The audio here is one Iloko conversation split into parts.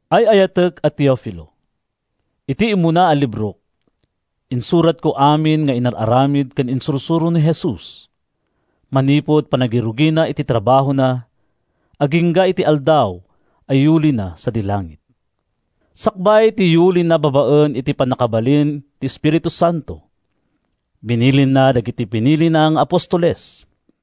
Ay-ayatek a Teofilo, Iti immuna a librok, insuratko amin nga inar-aramid ken insursuro ni Jesus, manipud panangirugina iti trabahona agingga iti aldaw a yuulina sadi langit. Sakbay ti yuulina babaen iti pannakabalin ti Espiritu Santo, binilinna dagiti pinilina nga apostoles.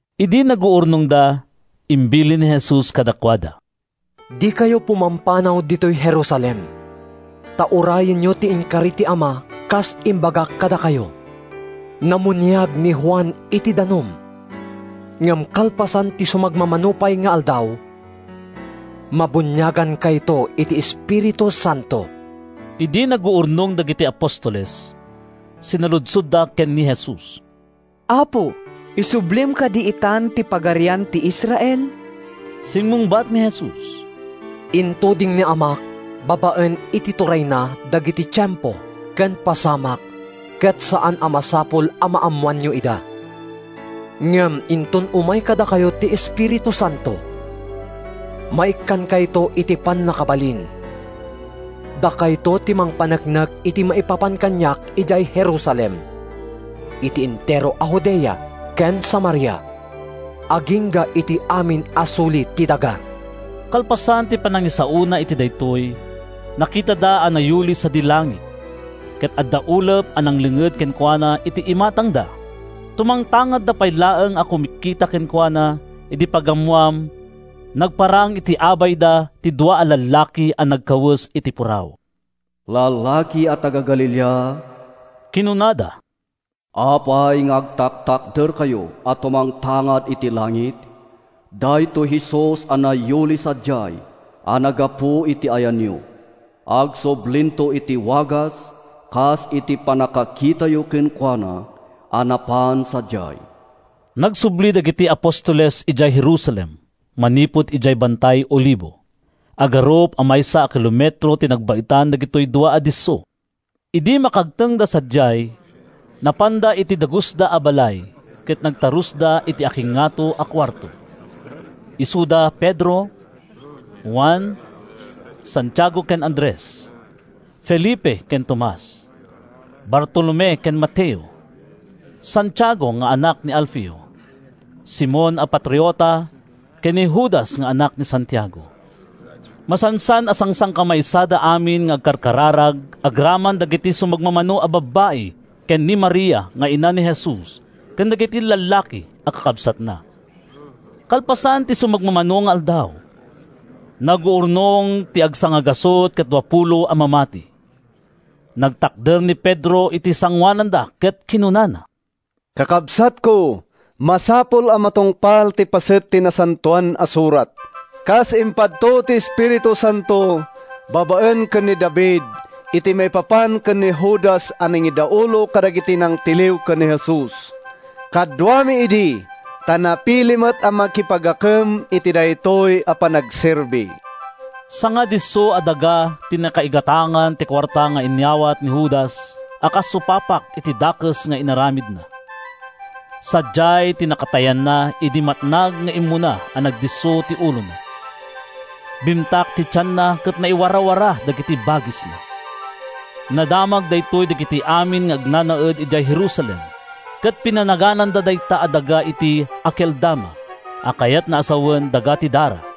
Idi naguurnongda, imbilin ni Jesus kadakuada: “Dikayo pumampanaw ditoy Jerusalem, ta urayenyo ti inkari ti Ama kas imbagak kadakayo. Namuniag ni Juan iti danum, ngem kalpasan ti sumagmamano pay nga aldaw, mabuniagankayto iti Espiritu Santo.” Idi naguurnong dagiti apostoles, sinaludsodda ken ni Jesus, “Apo, isublim kadi itan ti Pagarian iti Israel?” Simmungbat ni Jesus: “Intuding ni Amak, babaen iti turayna, dagiti tiempo ken pasamak ket saan a masapul a maammoanyo ida. Ngem inton umay kadakayo ti Espiritu Santo, maikkankayto iti pannakabalin. Dakayto ti mangpaneknek iti maipapan kaniak idiay Jerusalem, iti entero a Judea ken Samaria, agingga iti amin a suli ti daga.” Kalpasan ti panangisaona iti daytoy, nakitada a nayuli sadi langit, ket adda ulep a nanglinged kenkuana iti imatangda. Tumangtangadda pay laeng a kumitkita kenkuana idi pagammoan, nagparang iti abayda ti dua a lallaki a nagkawes iti puraw. “Lallaki a taga-Galilea,” kinunada, “apay nga agtaktakderkayo a tumangtangad iti langit? Daytoy Jesus a nayuli sadiay a naggapu iti ayanyo, agsublinto iti wagas a kas iti pannakakitayo kenkuana a napan sadiay.” Nagsubli dagiti apostoles idiay Jerusalem manipud idiay Bantay Olivo. Agarup a maysa a kilometro ti nagbaetan dagitoy dua a disso. Idi makagtengda sadiay, napanda iti dagusda a balay ket nagtarusda iti akingngato a kuarto. Isuda da Pedro, Juan, Santiago ken Andres, Felipe ken Tomas, Bartolome ken Mateo, Santiago nga anak ni Alfeo, Simon a Patriota ken ni Judas nga anak ni Santiago. Masansan a sangsangkamaysada amin nga agkarkararag agraman dagiti sumagmamano a babbai ken ni Maria nga ina ni Jesus ken dagiti lallaki a kakabsatna. Kalpasan ti sumagmamano nga aldaw, naguurnong ti agsangagasut ket duapulo a mamati. Nagtakder ni Pedro iti sangoananda ket kinunana: “Kakabsatko, masapul a matungpal ti paset ti Nasantoan a Surat, kas impadto ti Espiritu Santo babaen ken ni David iti maipapan ken ni Judas a nangidaulo kadagiti nangtiliw ken ni Jesus. Kaduami idi, ta napili met a makipagakem iti daytoy a panagserbi.” ( Sangadisso a daga ti nakaigatangan ti kuarta nga inawat ni Judas a kas supapak iti dakes nga inaramidna. Sadiay ti nakatayanna idi matnag nga immuna a nagdisso ti ulona. Bimtak ti tianna ket naiwarawara dagiti bagisna. Nadamag daytoy dagiti amin nga agnanaed idiay Jerusalem ket pinanagananda dayta a daga iti “Akeldama” a kayatna a sawen, “Daga ti Dara.”)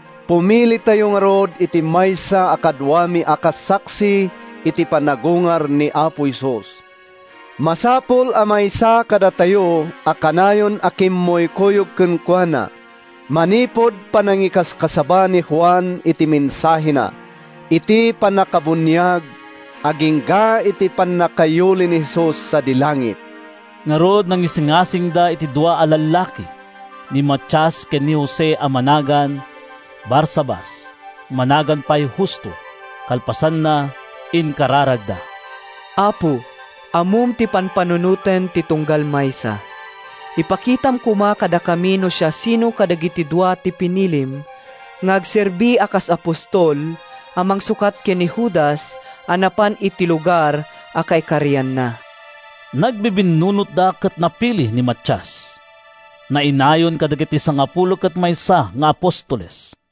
“Pumilitayo ngarud iti maysa a kaduami a kas saksi iti panagungar ni Apo Jesus. Masapul a maysa kadatayo a kanayon a kimmuykuyog kenkuana, manipud panangikasaba ni Juan iti mensahena iti pannakabuniag agingga iti pannakayuli ni Jesus sadi langit.” Ngarud, nangisingasingda iti dua a lallaki: ni Matias ken ni Jose a managan “Barsabas” (managan pay “Justo”). Kalpasanna, inkararagda, “Apo, ammom ti pampanunoten ti tunggal maysa. Ipakitam koma kadakami no siasino kadagiti dua ti pinilim nga agserbi a kas apostol a mangsukat ken ni Judas a napan iti lugar a kaikarianna.” Nagbibinnunotda ket napili ni Matias. Nainayon kadagiti sangapulo ket maysa nga apostoles.